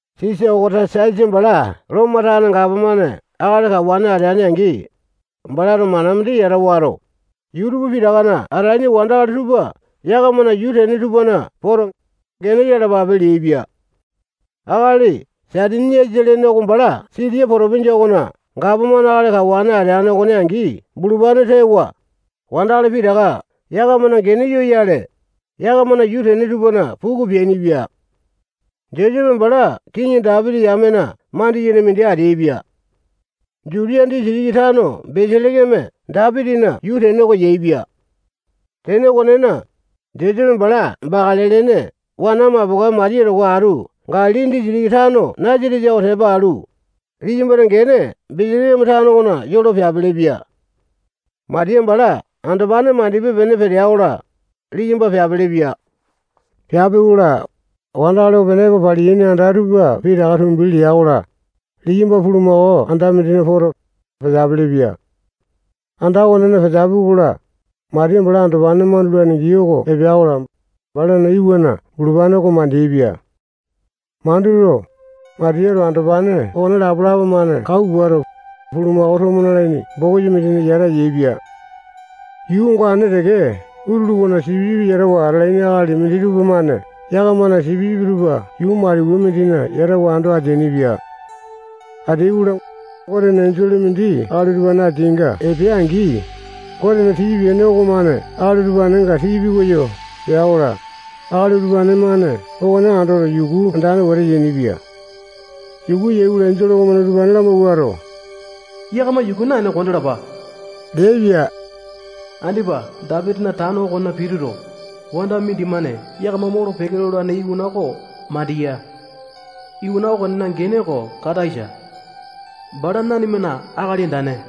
Sisa Okasatasa bala Lomo tane gapomane akali kawane ateane-angi, balato mana mindi yata wato, yuu pitakana atalaini wandakali tupa yakamana yuu tene tupana poto, gene yalapape leaipia. Akali Saitiniasa lene oko bala Sitiya potopinja okona gapomane akali kawane ateane okone angi bulupane tewa, wandakali pitaka yakamana gene yoyale, yakamana yuu tene tupana puku peainipia. Josepe bala kiŋi Dapiti yamena mandiyene mindi ateaipia. Jutiya disitiki tano Beselekeme Dapitina yuu tene oko yaepia. Tene okonena, Josepe bala bakale lene wana mapokae Matiya towa atu Galili disitiki tano Nasatesa oko tepa alu, liyambana gene Beselekeme tano okona yolo peapelepia. Matiya bala andopane mandipe-pene petea-kola, liyamba peapelepia. Peapi-kola, wandakali opene epo paliyaini anda tupa pitaka tumbi lea-kola, liyamba bulumako anda mindina poto, peteapele-pia. Anda okonena peteapi-kola, Matiya bala andopane mandulane gii oko epea-kola, balana iwana bulupane oko mandeaipia. Manduto, Matiyato andopane okone lapalapa-mane kau puato, bulumako tomo nalaini bokisa mindina yata yaepia. Yuu ongane teke utulu okona yia sipisipi yatawa atalaini akali minditupa-mane yakamana yia sipisipi tupa yuu maliwa mindina yatawa ando ateainipia. Ateai-kola, Gotena enjole mindi akali utupane ateainga epea-angi, Gotena tii-pene okomane akali utupanenga tii pikoyo pea-kola, akali utupane-mane okone andoto, yuku andane wete yainipia. Yuku yai-kola, enjole okomane utupane lamawuato, yakama yuku naene kondalapa leaipia. Andipa Dapitina tano okona pituto, wanda mindimane yakama molo-peke lolane iwana oko mandiya. Iwana okonena gene oko Kataisa. Bala nanimana Akali Andane.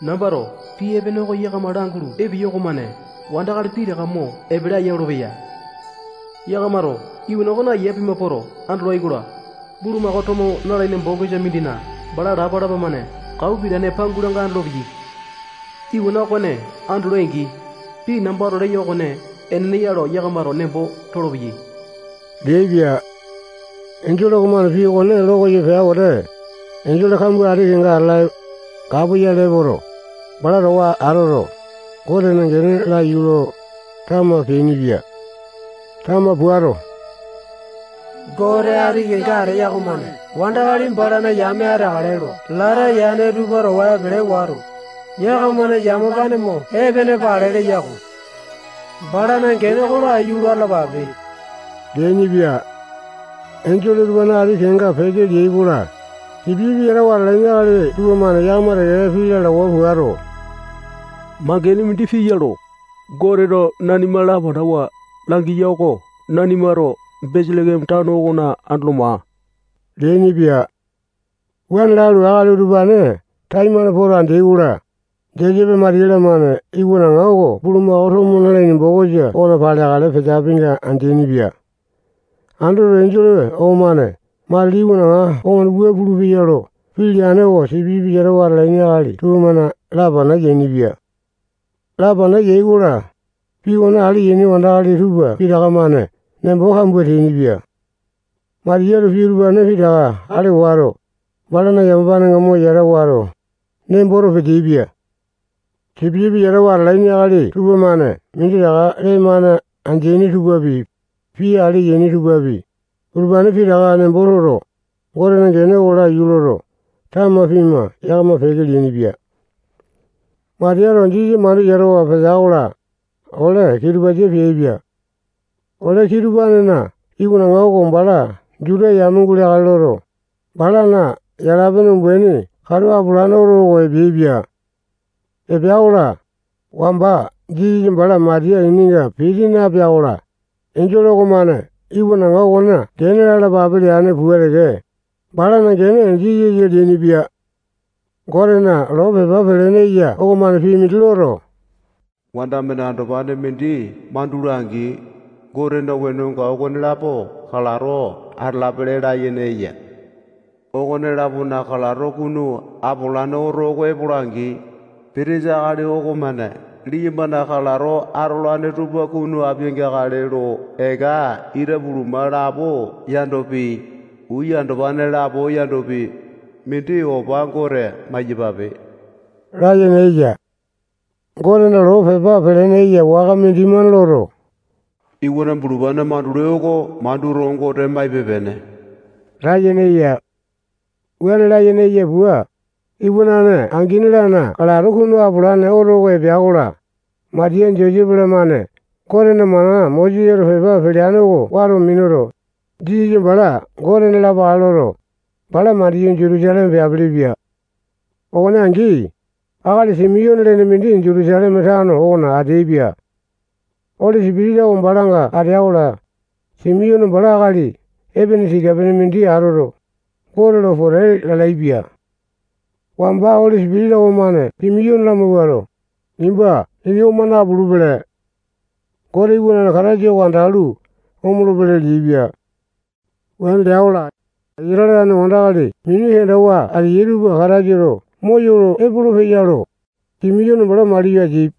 Nambato pii epene oko yakama langulu epeyo okomane wandakali pitaka mo epele aya olopeya. Yakamato iwana okone ayia pima poto andolai-kola, bulumako tomo nalaini bokisa mindina bala lapalapa-mane kau pitane pangulanga andolopeyai. Iwana okone andolai-angi, pii nambato leyo okone enene ya lo yakamato nembo tolopeyai leaipia. Enjole okomane pii okone lo koyo pea wete, enjole kambua wete ati kenga atala, kapoyale epoto, bala towa atu atoto, Gotena gene oko laiyu lo, tama peainipia. Tama puato, Gote ati kenga ateya okomane wandakali balana yame ateakale lo lata yane tupa towa epele wato, yakamana yamapane mo epene pale leya-ko. Balana gene oko laiyu lo atalapape leainipia. Enjole utupane ati kenga peke leai-kola, sipisipi yatawa atalaini akali tupamane yakama teke-teke pii lalawa puato, mangene mindi piya lo, Goteto nanima lapanawa langiya oko nanimato Beselekeme tano okona andolo maa leainipia. Wuane lalu, akali utupane taimane poto andeai-kola, Josepe Matiya-lamane iwanaŋa oko bulumako tomo nalaini bokisa okona paleakale peteapinga andeaini-pia. Andoto, enjole okomane matili iwanaŋa okomane wua pulupeya lo pii leane oko sipisipi yatawa atalaini akali tupamane lapana yainipia. Lapana yai-kola, pii okone ale yaini wandakali tupa pitaka-mane nembo kambua teainipia. Matiyato pii utupane pitaka ale wato, balana yamapanenga mo yata wato, nemboto peteaipia. Sipisipi yatawa atalaini akali tupamane minditaka lee-mane andeaini tupapi, pii ale yaini tupapi, utupane pitaka nembo toto, Gotena gene oko laiyu loto, tama pima yakama peke leainipia. Matiyato Jisasa mandu yatawa petea-kola, ole kitupasa peaipia. Ole kitupanena iwanaŋa oko bala Juta yame guleakale loto, balana yala-pene umbaini katu apolane oto oko epeaipia. Epea-kola, wamba Jisasa bala Matiya ininga piti napea-kola, enjole okomane iwanaŋa okona gene lalapape leane pua teke, balana gene Jisasa leainipia. Gotena loo pepa pelene eya okomane pii mindi loto, wanda-mane andopane mindi mandula-angi, Gotena wenonga okonelapo kalato atalapele layene eya. Okone-lapona kalato kunu apolane oto oko epola-angi, pitisa akali okomane liyambana kalato atolane tupa kunu apia-geakale lo eka itapuluma lapo yandopi, uya andopane lapo yandopi, mindi opa Gote maiyapape layene eya. Gotena loo pepa pelene eya waka mindimane loto, iwana bulupane mandulai oko manduto, Gote maipe-pene layene eya. Wuane layene eya pua, iwanane angini-lana kalato kunu apolane oto oko epea-kola, Matiya Josepe-lamane Gotena mana Mosesato pepa peleane oko wato minuto, Jisasa bala Gotena lapakale loto, bala mandiyu, Jutusaleme peapelepia. Okone angi, akali Simiyone lene mindi Jutusaleme tano okona ateaipia. Oli Sipitisa oko balanga atea-kola, Simiyone bala akali epene tika-pene mindi atoto, Gote lo pote lalaepia. Wamba Oli Sipitisa okomane Simiyone lamawuato, nimba ini oma napulupele. Gotena iwanane Kataisa oko andalu, omolopele leaipia. Wuane lea-kola, Isatale tane wandakali mini kendawa ateyai tupa Kataisato moyolo epolopeya lo, Simiyone bala maliyo ateaipia.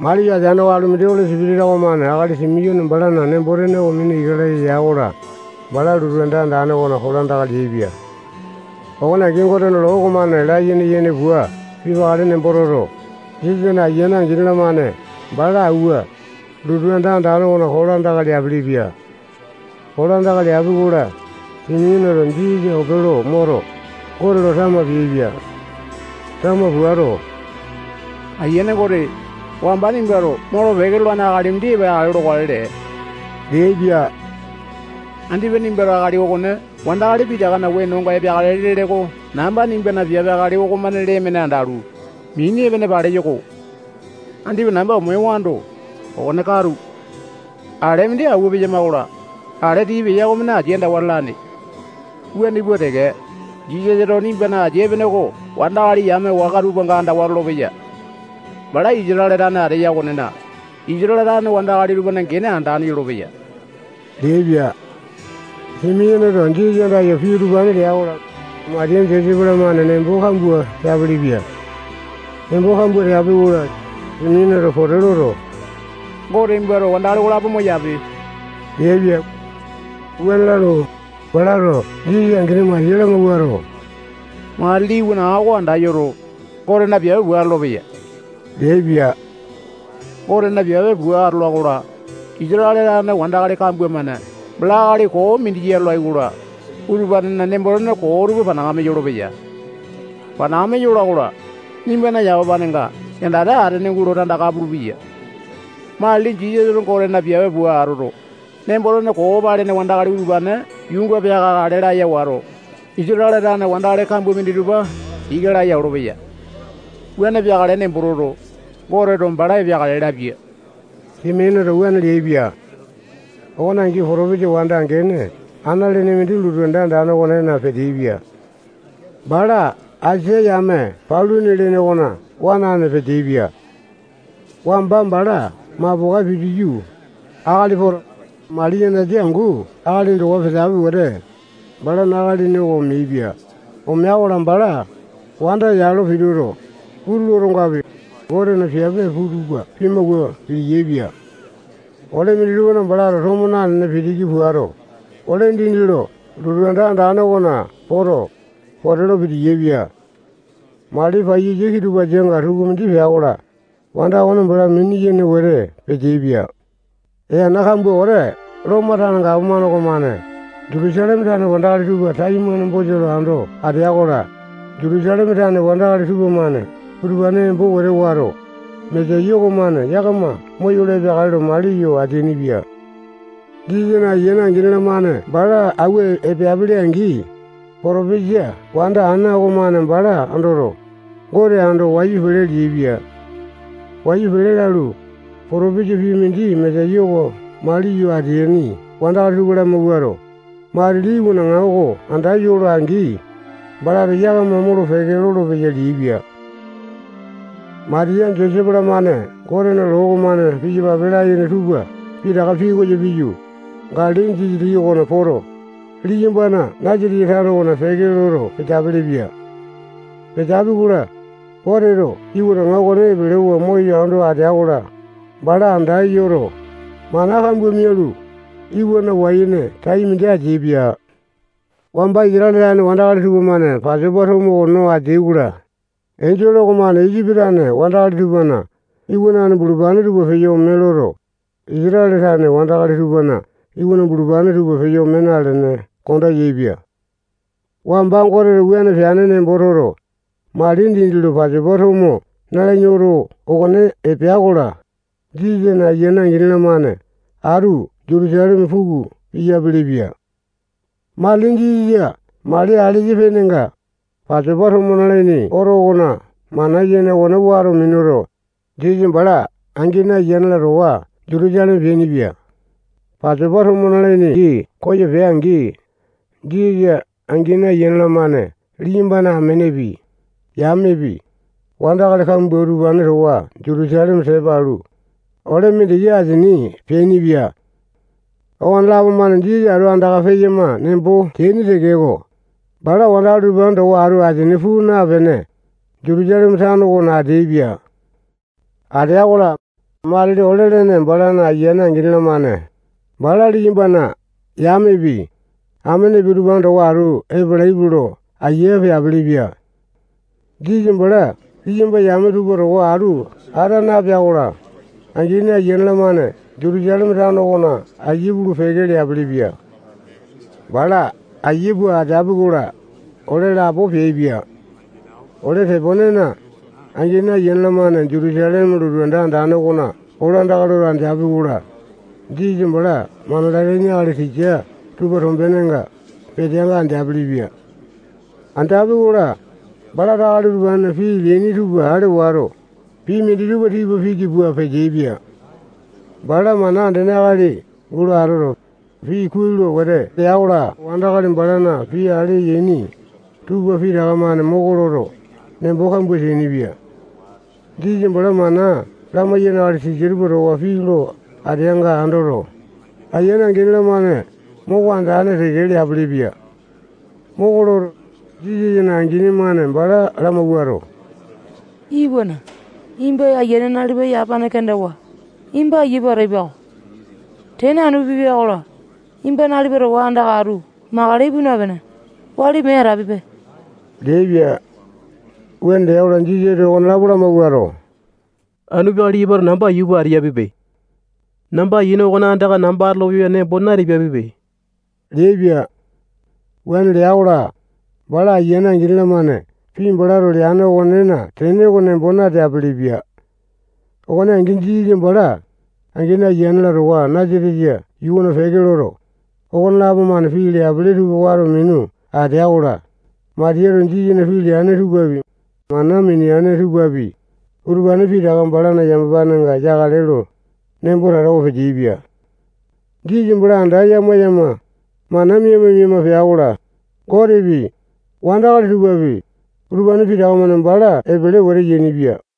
Maliyo ateaneko, alu mindi Oli Sipitisa okomane akali Simiyone balana nembo-tene oko mina ika laya ya-kola, bala lotu anda andane okona kolandaka leaipia. Okone angi, Gotena loo okomane layene yene pua pipakale nembo toto, Jisasana angini ayiane-lamane bala awua, lotu anda andane okona kolandaka leapelepia. Kolandaka leapi-kola, Simiyoneto Jisasa ope lo moto, Gote lo tama peaipia. Tama puato, Ayiane Gote, wamba nimbato molo-peke lolane akali mindi epeakale lokale lee leaipia. Andipa nimbato akali okone wandakali pitakana wenonga epeakale lele oko namba nimbana piape akali okomane lee-mane andalu, mini epene paleyo-ko. Andipa namba omewando, okone katu. Ale mindi awua peyama-kola, ale tii peya okomane asia andawa lalane. Wuane pua teke, Jisasato nimbana asia epene oko wandakali yame waka tupanga andawa lolopeya. Bala Isatale tane ateya okonena, Isatale tane wandakali tupana gene andane yolopeya leaipia. Simiyoneto Jisasa andayo pii utupane lea-kola, Matiya Josepe-lamane nembo kambua teapelepia. Nembo kambua teapi-kola, Simiyoneto pote loto, Gote nimbato wandakali okolapo moyape leaipia. Wuane lalu, balato Jisasa angini Matiya lamawuato, matili iwanaŋa oko anda yoto, Gotena piape pua atolopeya leaipia. Gotena piape pua atola-kola, Isatale tane wandakali kambua-mane bala akali koo mindi ya lolai-kola, utupanena nembo-tene koo tupa panakame yolopeya. Panakame yola-kola, nimbana yamapanenga yandate atene gulo tandaka pulupeya. Matili Jisasato Gotena piape pua atoto, nembo-tene koo palene wandakali utupane yuunga peakeakale laya wato, Isatale tane wandakali kambua minditupa ika laya olopeya. Wuane peakale nembo toto, Goteto bala epeakale lapia. Simiyoneto wuane leaipia. Okone angi potopisa wanda gene Ana lene mindi lotu anda okonena peteaipia. Bala Asa yame Panule lene okona wanane peteaipia. Wamba bala mapokae pitiyu, akali poto, mali yanasa angu akalini towa peteapi wete, balana akalini oko omeaipia. Omea-kola, bala wanda yalo pituto, utulu otongapi, Gotena piape tupa pimawua piti-yaepia. Ole minditupa balato tomo nanene pitiki puato, ole dindi lo lotu anda andane okona poto, pote lo piti-yaepia. Mali paiyasa kitupasanga tukumindi pea-kola, wanda okone bala mini-yene wete peteaipia. Ee ana kambua wete Lomo tane gapomane okomane Jutusaleme tane wandakali tupa taimane bosa lo ando atea-kola, Jutusaleme tane wandakali tupamane utupane embo wato, Mesaya okomane yakama moyolo epeakale lo mali yo ateainipia. Jisasana angini ayiane-lamane bala awua epeapele-angi, potopesa wanda Ana okomane bala andoto, Gote ando wayu pele leaipia. Wayu pele lalu, potopesa pii mindi Mesaya oko maliyo ateaini wandakali tupa lamawuato, matili iwanaŋa oko anda yola-angi, balato yakama molo-peke lolopeya leaipia. Matiya, Josepe-lamane Gotena loo okomane piyapape layene tupa pitaka pikoyo piyu, Galili disitiki okona poto, liyambana Nasatesa tano okona peke loto peteapele-pia. Peteapi-kola, Goteto iwanaŋa okone epelewa moyo ando atea-kola, bala anda yoto, mana kambua mialu, iwana wai-ene tai mindi ateaipia. Wamba Isatale tane wandakali tupamane Pasopa tomo oko no ateai-kola, enjole okomane Isipi tane wandakali tupana iwanane bulupane tupa peyo ome loto, Isatale tane wandakali tupana iwana bulupane tupa peyo ome nalene konda yaepia. Wamba Goteto wuane peane nembo toto, mali dindi lo Pasopa tomo nalaini oto okone epea-kola, Jisasana angini, ayiane-lamane atu Jutusaleme puku piyapele-pia. Matili Jisasa mali alesa penenga, Pasopa tomo nalaini oto okona mana yene okone wato minuto, Jisasa bala angini, ayiane-la towa Jutusaleme peainipia. Pasopa tomo nalaini gii koyo pea-angi, Jisasa angini ayiane-lamane liyambana amenepi, yamepi, wandakali kambua utupane towa Jutusaleme tepa alu, ole mindiki asini peainipia. Okonelapo-mane Jisasa atu andaka peyama nembo teaini tekeko, bala wandakali utupane towa atu asini puu napene, Jutusaleme tano okona ateaipia. Atea-kola, matili ole lene balana angini, ayiane-lamane bala liyambana yamepi, amenepi, utupane towa atu epalaipe lo ayia peapelepia. Jisasa bala liyamba yame tupa towa atu ata napea-kola, angini ayiane-lamane Jutusaleme tano okona ayia pulu-peke leapelepia. Bala ayia pua ateapi-kola, ole lapo peaipia. Ole teponena angini, ayiane-lamane Jutusaleme lotu anda andane okona kolandaka loto andeapi-kola, Jisasa bala mana lalaini akali tisa tupana tombenenga peteanga andeapele-pia. Andeapi-kola, balato akali utupanena pii leaini tupa ale wato, pii minditupa tipa pita piki pua peteaipia. Bala mana andene akali gulo atoto, pii kuai lo wete lea-kola, wandakali balana pii ale yaini tupa pitaka-mane moko loto, nembo kambua teainipia. Jisasa bala mana lamayaini tisa tupa towa pii lo ateanga andoto, angini ayiane-lamane moko andane teke leapelepia. Moko loto, Jisasana angini-mane bala lamawuato, iwana, nimba ayiane nalipa yamapane kendawa, nimba ayia pua ataipa-ko. Tene anu pipia-kola, nimba nalipa towa andaka atu makale ipu napene, wali mee atapipe leaipia. Wuane lea-kola, Jisasato okonelapo lamawuato, anu peakale liyambato namba ayia pua atapiapipe. Namba ayiane okona andaka namba atolopeya nembo na-tapiapipe leaipia. Wuane lea-kola, bala angini ayiane-lamane pii balato leane okonena tene oko nembo nateapele-pia. Okone angi, Jisasa bala angini, ayiane-la towa Nasatesa yuu okona peke loto, okonelapo-mane pii leapele tupa wato minu atea-kola, Matiyato Jisasana pii leane tupapi, mana mineane tupapi, utupane pitaka balana yamapanenga yakale lo, nembo tatawa peteaipia. Jisasa bala anda yama-yama, mana mima-mima pea-kola, Gotepi, wandakali tupapi, utupane pitaka-mane bala epele wete yainipia.